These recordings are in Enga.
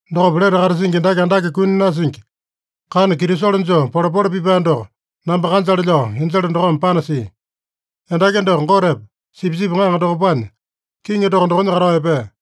Dokopa lete katasingi endaki andake kuni nasingi, kana kitisolo joo polepole pipae doko namba kanjale lao, enjele dokome panasia. Endaki doko Gotepa, Sipisipi Ŋaŋa dokopanya kiŋi toko dokonya katao epea.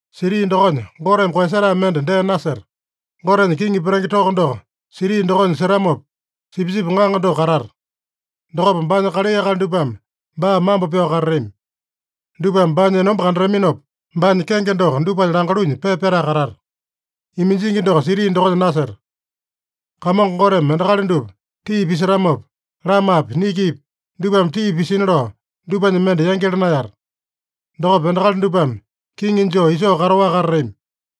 Siti dokonya Goteme koeyasetae mende dee naseta. Gotenya kiŋi petenge toko doko siti dokonya setamopa, Sipisipi Ŋaŋa doko katata. Dokopa baanya kalai akali dupame baa mambo pyao katatami. Dupame baanya enomba kandataminopa, baanya kenge doko dupanya langalunya pepa pyatae katata. Iminjingi doko siti dokonya naseta. Kamongo Goteme endakali dupa tii pisetamopa, lamapi, nikipi dupame tii pisina lao, dupanya mende yangyala naeyata. Dokopa endakali dupame kiŋi joo isoo kataowaka katatami.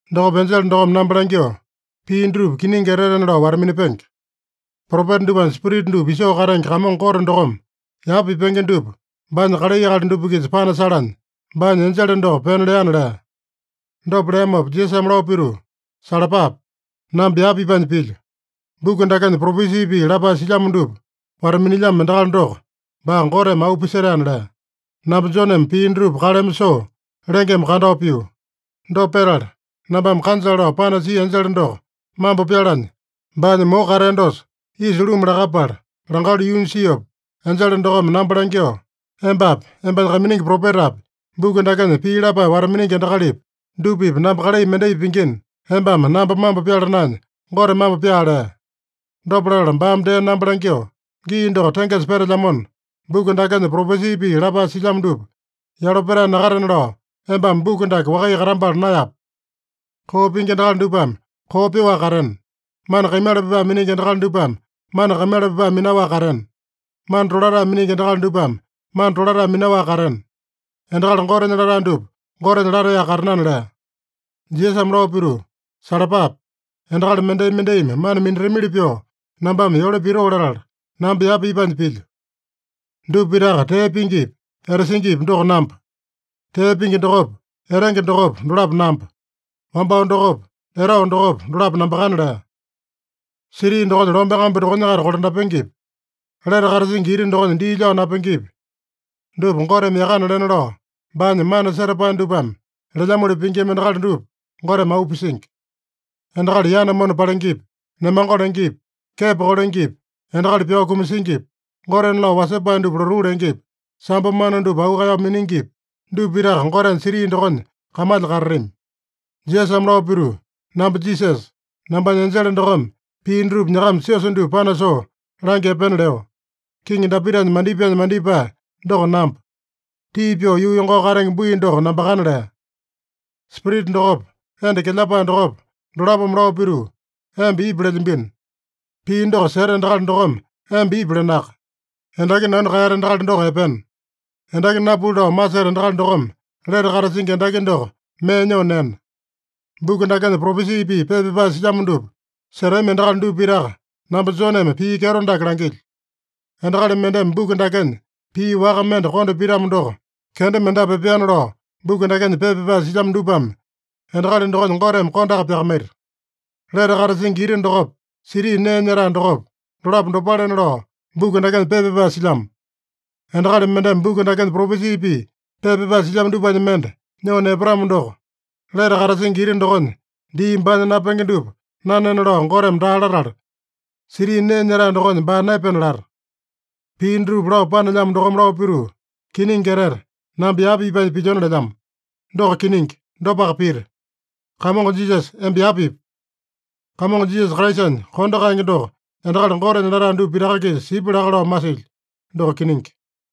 Dokopa enjele dokome namba langyoo, “Pii dutupa kiningi etetena lao wata-minapenge. Propeta dupanya spirita dupa isoo katenge Kamongo Gote dokome yapa pipenge dupa baanya kalai akali dupa-kisa panasalanya, baanya enjele doko pena leana” lea. Dopa leamopa Jisasame lao pituu, “Salapape! Namba yapa ipanya pilyo. Buku dakenya propesi pii lapae silyamo dupa wata-minilyamo endakali doko, baa Goteme auu pisetaena” lea. Namba Joneme pii dutupa kaleme soo, lengeme kandao pio. Dopa petala, nambame kanjale lao panasia enjele doko mambo pyalanya, baanya moko katea dosa isa luma lakapala langalu yuunya siopa, enjele dokome namba langyoo, “Embapi, embanya kaiminingi propetapi, buku dakenya pii lapae wata-miningi endakalipi, dupa-pipa namba kalai mendai pingina, embame namba mambo pyala naenya, Gote mambo pyaa” lea. Dopa latala baame dee namba langyoo, “Gii doko tengesa petelyamona, buku dakenya propesi pii lapae silyamo dupa yalo petae nakatena lao, embame buku dake wakaiya katambala naeyape. Koo pingi endakali dupame koo pyoaka katena. Mana kaimala pipae miningi endakali dupame mana kaimala pipae minaowaka katena. Mana tolatae miningi endakali dupame mana tolatae minaowaka katena. Endakali Gotenya latae dupa Gotenya lataeyaka katenana” lea. Jisasame lao pituu, “Salapape! Endakali mendai-mendaimi mana minatamili pyoo nambame yole pitoo latala, namba yapa ipanya pilyo. Dupa pitaka tee pingipi, etasingipi doko namba. Tee pingi dokopa, etenge dokopa, dolapo namba. Wambao dokopa, etao dokopa, dolapo nambakana” lea. Siti dokonya lome kambu dokonya-kaita kolandapengepi, lete katasingi ita dokonya dii lyao napengepi, dupa Goteme yakana lena lao, baanya mana setapae dupame lelyamoli pingima endakali dupa Goteme auu pisingi. Endakali yana mona palengepi, nemango lengepi, kepo kolengepi, endakali pyao kumasingipi, gotena lao wasepae dupa lotuu lengepi, sambo mana dupa auu kaeyao miningipi, dupa pitaka Gotenya siti dokonya kamalya katatami. Jisasame lao pituu, “Namba Jisasa, nambanya enjele dokome pii dutupa nyakama siosa dupa panasoo langya epena leo. Kiŋi Dapitanya mandipaenya mandipae doko namba. Tii pyoo yuu yongao katenge bui doko nambakana” lea. Spirita dokopa, enda kelyapae dokopa, dolapome lao pituu, “Emba ipu” lelyambino. Pii doko seta endakali dokome, “Emba ipu” lenaka. Endaki nanu kaeyata endakali doko epena. Endaki napuli lao maseta endakali dokome lete katasingi endaki doko mee nyoo nena. Buku dakenya propesi pii pepa pyapae silyamo dupa setami endakali dupa pitaka namba Joneme pii kyeto dake langilyo: Endakali mendeme buku dakenya pii waka mende konda pitamo doko, kenda mendapu epeana lao buku dakenya pepa pyapae silyamo dupame endakali dokonya Goteme kondaka pyakamaita. Lete katasingi ita dokopa, siti nee nyetae dokopa, dolapo dopalena lao, buku dakenya pepa pyapae silyamo. Endakali mendeme buku dakenya propesi pii pepa pyapae silyamo dupanya mende nyoo nepatamo doko, lete katasingi ita dokonya dii baanya napenge dupa nanena lao Goteme daa latala, siti nee nyetae dokonya baa naepena lata. Pii dutupa lao panelyamo dokome lao pituu, “Kiningi etete, namba yapa ipanya pilyona” lelyamo. Doko kiningi. Dopaka pita. Kamongo Jisasa, emba yapa ipu! Kamongo Jisasa Kraisanya kondo kaenge doko endakali Gotenya latae dupa pitaka-kisa sipya laka lao masilyo. Doko kiningi.